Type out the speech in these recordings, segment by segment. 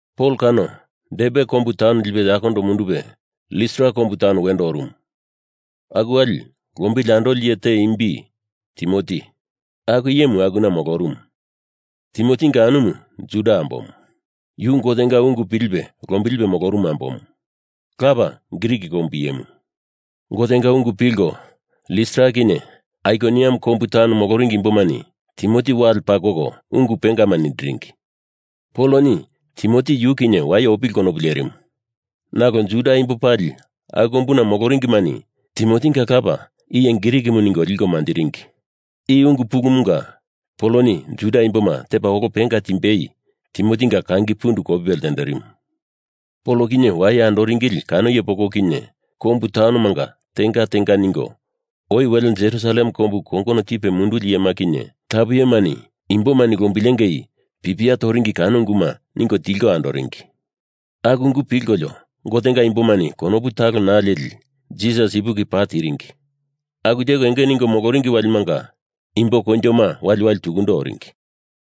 Pol kano Derbe kombu taun lipe yakondo mundupe Listra kombu taun wendo orumu. Aku wali lombili andoli iye te imbi Timoti, aku iyemu akuna molorumu. Timotinga anumu Juda ambomu. Yu Gotenga ungu pilipe lombilipe molorumu ambomu. Lapa Grik kombu iyemu. Gotenga ungu pilko Listra kinye Aikoniam kombu taun moloringi imbomani Timoti wale pakoko ungu pengama nindiringi. Poloni Timoti yu kinye waye opili konopu lerimu. Nalo Juda imbo pali aku kombuna moloringimani Timotinga lapa iye Grikimu ningo liko manjiringi. I ungu pulumunga Poloni Juda imboma tepa olo penga timbei, Timotinga kangi pundu kopipe ltenderimu. Pol kinye waye andoringili kano iye poko kinye kombu taunomanga tenga tenga ningo oi wele Jerusalem kombu kongono tipe munduli iyema kinye tapu iyemani imbomani lombilengei pipia toringi kano unguma ningo tilko andoringi. Aku ungu pilkolio Gotenga imbomani konopu talo naa leli Jisas ipuki paa tiringi. Aku teko enge ningo moloringi walimanga imbo koinjoma waliwali tukundo oringi.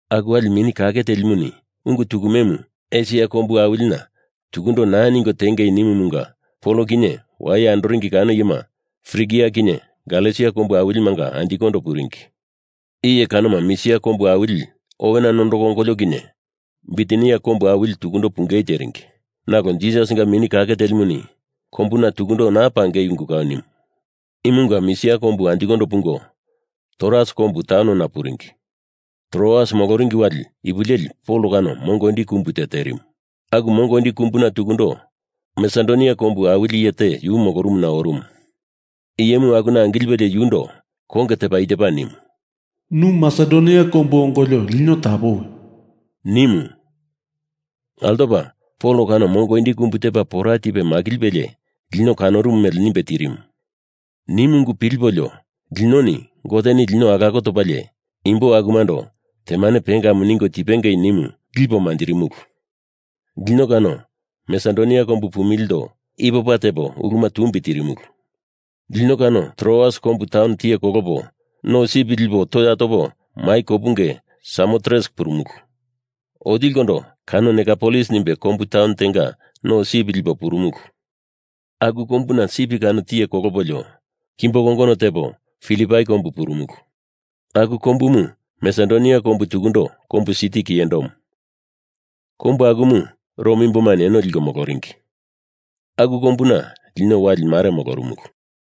Aku wali Mini Kake Telimuni ungu tukumemu Esia kombu awilina tukundo naa ningo tengei nimumunga Pol kinye waye andoringi kano iyema Frigia kinye Galesia kombu awilimanga anjikondo puringi. Iye kanoma Misia kombu awili owena nondoko ongolio kinye Bitinia kombu awili tukundo pungei teringi. Nalo Jisasinga Mini Kake Telimuni kombuna tukundo naa pangei ungu kau nimu. Imunga Misia kombu anjikondo pungo Troas kombu taunona puringi. Troas moloringi wali ipu leli Pol kano mongo indi kumbu te terimu. Aku mongo indi kumbuna tukundo Masedonia kombu awili iye te yu molorumuna orumu. Iyemu akuna angilipelie yundo konge tepa i tepa nimu, “Nu Masedonia kombu ongolio lino tapowi,” nimu. Altopa Pol kano mongo indi kumbu tepa pora tipe makilipelie lino kanorumu mele nimbe tirimu. Nimu ungumu pilipolio linoni Goteni lino alako topalie imbo akumando temane pengamu ningo tipengei nimu lipo manjirimulu. Lino kano Masedonia kombu pumilindo ipopa tepo uluma tumbi tirimulu. Lino kano Troas kombu taun tiye kolopo no sip lipolio toya topa mai kopunge Samotres purumulu. Otilikondo kano Neapolis nimbe kombu taun tenga no sip lipo purumulu. Aku kombuna sip kano tiye kolopolio kimbo kongono tepo Filipai kombu purumulu. Aku kombumu Masedonia kombu tukundo kombu siti kiyendomu. Kombu akumu Rom imbomani eno liko moloringi. Aku kombuna lino wali mare molorumulu.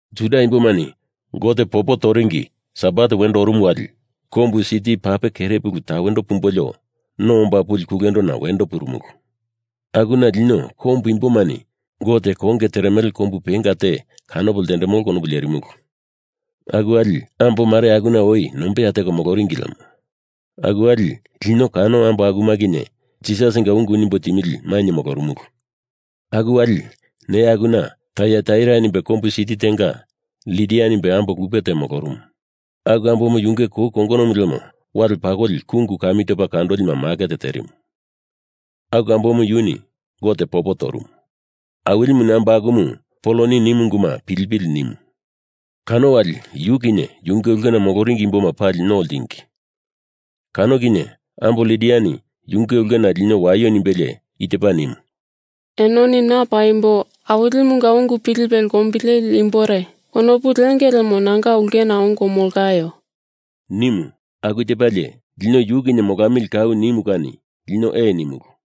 Juda imbomani Gote popo toringi Sabat wendo orumu wali kombu siti pape kere puluna tawendo pumbolio no omba puli kulendona wendo purumulu. Akuna lino kombu imbomani Gote konge teremele kombu penga te kanopo ltendemolo konopu lerimulu. Aku wali ambo mare akuna oi nombeya teko moloringi lemo. Aku wali lino kano ambo akuma kinye Jisasinga ungu nimbo timili mainye molorumulu. Aku wali neya akuna Taiataira nimbe kombu siti tenga Lidia nimbe ambo lupe te molorumu. Aku ambomu yunge kou kongonomu lemo wale pakoli kungu kami topa kandolima maket terimu. Aku ambomu yuni Gote popo torumu. Awilimuni ambo akumu Poloni nimu unguma pilipili nimu. Kano wali yu kinye yunge ulkena moloringi imboma pali no ltingi. Kano kinye ambo Lidia yunge ulkena lino waio nimbelie i tepa nimu, “Enoni na paimbo Awilimunga ungu pilipe lombileli imbore konopu lenge lemo nanga ulkena ongo molaio,” nimu. Aku tepalie lino yu kinye molamili kau nimu kani lino ee nimulu.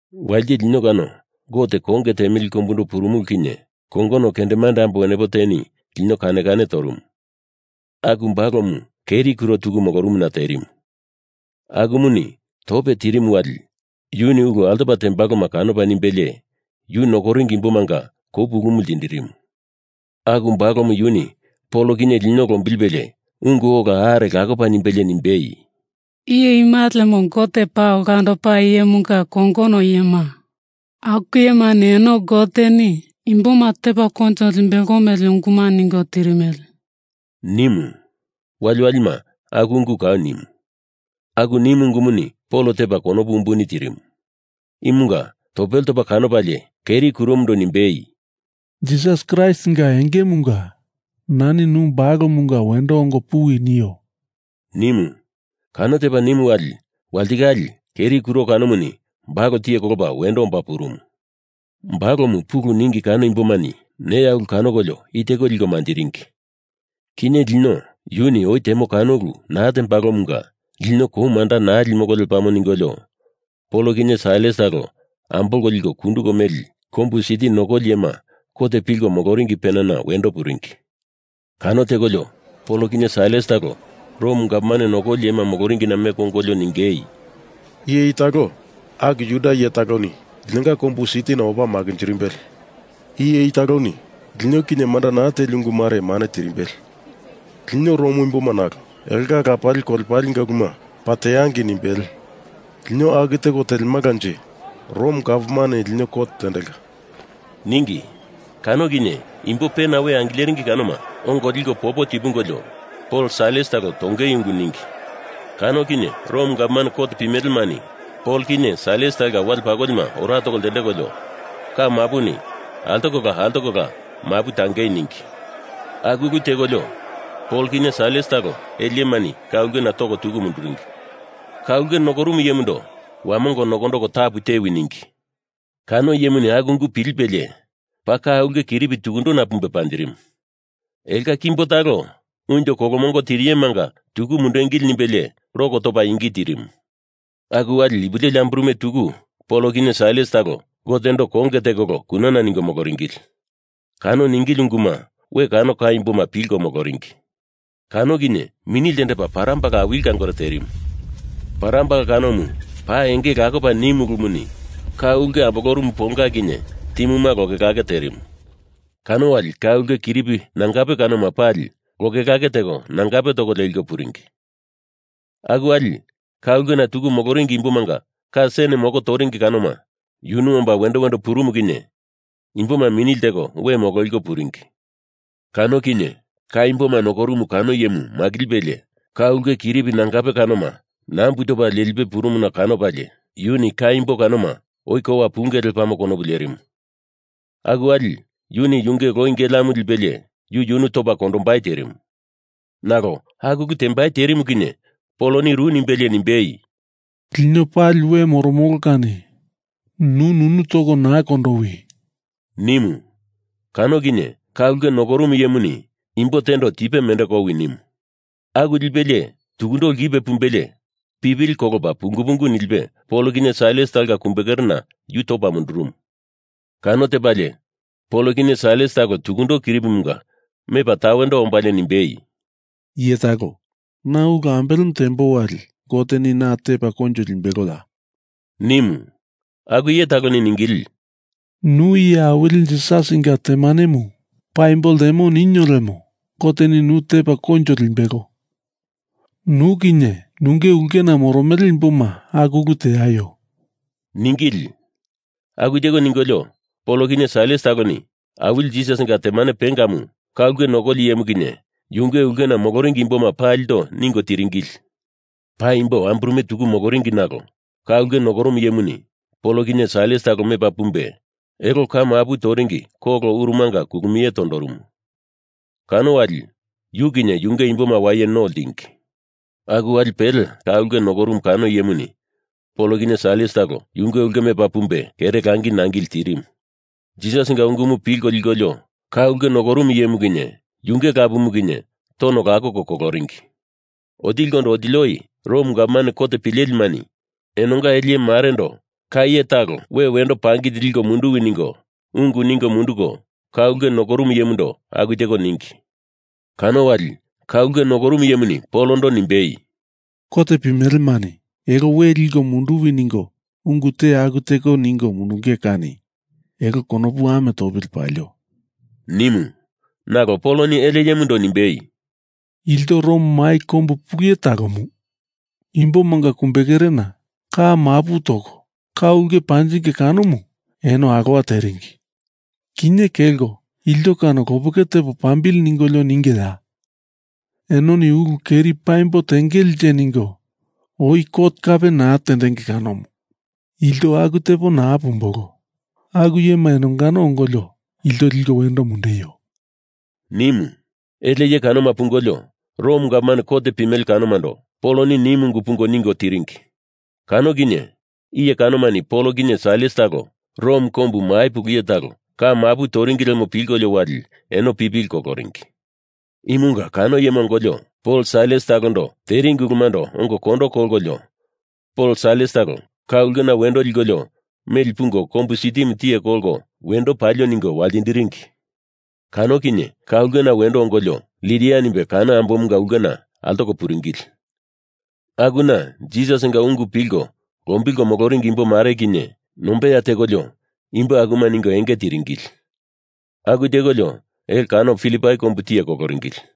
Walite lino kano Gote konge temili kombundo purumulu kinye kongono kendemande ambo wenepo teni lino kane kane torumu. Aku balomu keri kuro tuku molorumuna terimu. Akumuni tope tirimu wali yuni ulu altopa tembaloma kanopa nimbelie yu nokoringi imbomanga kou pulumu ltindirimu. Aku balomu yuni Pol kinye lino lombilipelie ungu ola are lakopa nimbelie nimbei, “Iye ima lemo Gote paa olandopa iyemunga kongono iyema! Aku iyemani eno Goteni imboma tepa koinjo limbelo mele unguma ningo tirimele,” nimu. Waliwalima aku ungumu kau nimu. Aku nimu ungumuni Pol tepa konopu umbuni tirimu. Imunga topele topa kanopalie keri kuromundo nimbei, “Jisas Kraistinga engemunga nani nu balomunga wendo ongo puwi nio,” nimu. Kano tepa nimu wali, walitikale keri kuro kanomuni balo tiye kolopa wendo omba purumu. Balomu pulu ningi kano imbomani neya ulu kanokolio i teko liko manjiringi: Kinye lino yuni oi temo kano ulu naa tembalomunga lino kou manda naa limolo lepamo ningolio Pol kinye Sailas talo ambolko liko kunduko meli kombu siti nokoli iyema kot pilko moloringi penana wendo puringi. Kano tekolio Pol kinye Sailas talo Rom gavman nokoli iyema moloringina meko ongolio ningei, “Iye i talo aku Juda iye taloni linonga kombu sitina opa makinjirimbele. Iye i taloni lino kinye manda naa teli ungu mare mane tirimbele. Lino Rom imboma nalo elonga lapali kolepalenga uluma paa teangei nimbele. Lino aku teko telemalanje Rom gavman lino kot tendelka,” ningi. Kano kinye imbo penana we angileringi kanoma ongo liko popo tipungolio Pol Sailas talo tongei ungu ningi. Kano kinye Rom gavman kot pimelemani Pol kinye Sailas talonga wale pakolima ora toko ltendekolio ka mapuni altokola altokola mapu tangei ningi. Aku ulu tekolio Pol kinye Sailas talo ele iyemani ka ulkena toko tuku munduringi. Ka ulke nokorumu iyemundo wamongo nokondoko tapu tewi ningi. Kano iyemuni aku ungu pilipelie paa ka ulke kiripi tukundona pumbe panjirimu. Elonga kimbo talo unjo kolomongo tiriyemanga tuku mundengili nimbelie lok topa ingi tirimu. Aku wali ipu leli amburume tuku Pol kinye Sailas talo Gotendo konge tekolo kunana ningo moloringili. Kano ningili unguma we kano ka imboma pilko moloringi. Kano kinye mini ltendepa parambala awili kangore terimu. Parambala kanomu paa enge lakopa nimu ulumuni ka ulke ambolorumu ponga kinye timuma lokelake terimu. Kano wali ka ulke kiripi nangape kanoma pali lokelake teko nangape toko leko puringi. Aku wali ka ulkena tuku moloringi imbomanga ka sen moko toringi kanoma yunu omba wendo wendo purumu kinye imboma mini lteko we mololiko puringi. Kano kinye ka imboma nokorumu kano iyemu makilipelie ka ulke kiripi nangape kanoma nambu topa lelipe purumuna kanopalie yuni ka imbo kanoma oi kowa punge lepamo konopu lerimu. Aku wali yuni yunge loi geleamu lipelie yu yunu topa kondombai terimu. Nalo aku ulu tembai terimu kinye Poloni ru nimbelie nimbei, “Lino pali we moromolo kani nu nunu toko naa kondowi,” nimu. Kano kinye ka ulke nokorumu iyemuni imbo tendo tipe mendeko owi nimu. Aku lipelie tukundo lkipe pumbelie pipili kolopa pungu pungu nilipe Pol kinye Sailas talonga kumbekerena yu topa mundurumu. Kano tepalie Pol kinye Sailas talo tukundo kiripimunga mepa tawendo ombalie nimbei, “Iye talo, na ulu ambelemu tembo wali Goteni na tepa koinjo limbeloya?” nimu. Aku iye taloni ningili, “Nu iye awili Jisasinga temanemu paimbo ltemo ninio lemo Goteni nu tepa koinjo limbelo. Nu kinye nunge ulkena moromele imboma aku ulu teaio,” ningili. Aku teko ningolio Pol kinye Sailas taloni Awili Jisasinga temane pengamu ka ulke nokoli iyemu kinye yunge ulkena moloringi imboma palindo ningo tiringili. Paimbo amburume tuku moloringi nalo ka ulke nokorumu iyemuni Pol kinye Sailas talo mepa pumbe elo ka mapu toringi kolo urumanga kulumie tondorumu. Kano wali yu kinye yunge imboma waye no ltingi. Aku wali pele ka ulke nokorumu kano iyemuni Pol kinye Sailas talo yunge ulke mepa pumbe kere langi nangili tirimu. Jisasinga ungumu pilko likolio ka ulke nokorumu iyemu kinye yunge lapumu kinye tono lakoko koloringi. Otilikondo otili oi Rom gavman kot pimelemani enonga ele iye marendo kano iye talo we wendo pangili liko munduwi ningo ungu ningo munduko ka ulke nokorumu iyemundo aku teko ningi. Kano wali ka ulke nokorumu iyemuni Polondo nimbei, “Kot pimelemani elo we liko munduwi ningo ungu te aku teko ningo mundunge kani elo konopu ame topa lepili palio,” nimu. Nalo Poloni ele iyemando nimbei, “Ilto Rom kombu mai pulu iye talomu imbomanga kumbekerena ka mapu toko ka ulke panjinge kanomu eno alowa teringi. Kinye kelko ilto kano lopeke tepo pambili ningolio ningeya? Enoni ulu keri paimbo tengelenje ningo oi kot kape naa tendenge kanomu. Ilto aku tepo naa pumbolo. Aku iyema enongano ongolio ilto liko wendo mundeio,” nimu. Ele iye kanoma pungolio Rom gavman kot pimele kanomando Poloni nimu ungu pungo ningo tiringi. Kano kinye iye kanomani Pol kinye Sailas talo Rom kombu mai pulu iye talo ka mapu toringi lemo pilkolio wali eno pipili koloringi. Imunga kano iyema ongolio Pol Sailas talondo teringi ulumando ongo kondo kolkolio Pol Sailas talo ka ulkena wendo likolio meli pungo kombu sitimu tiye kolko wendo palio ningo waltindiringi. Kano kinye ka ulkena wendo ongolio Lidia nimbe kano ambomunga ulkena altoko puringili. Akuna Jisasinga ungu pilko lombilko moloringi imbo mare kinye nombeya tekolio imbo akuma ningo enge tiringili. Aku tekolio elo kano Filipai kombu tiye koloringili.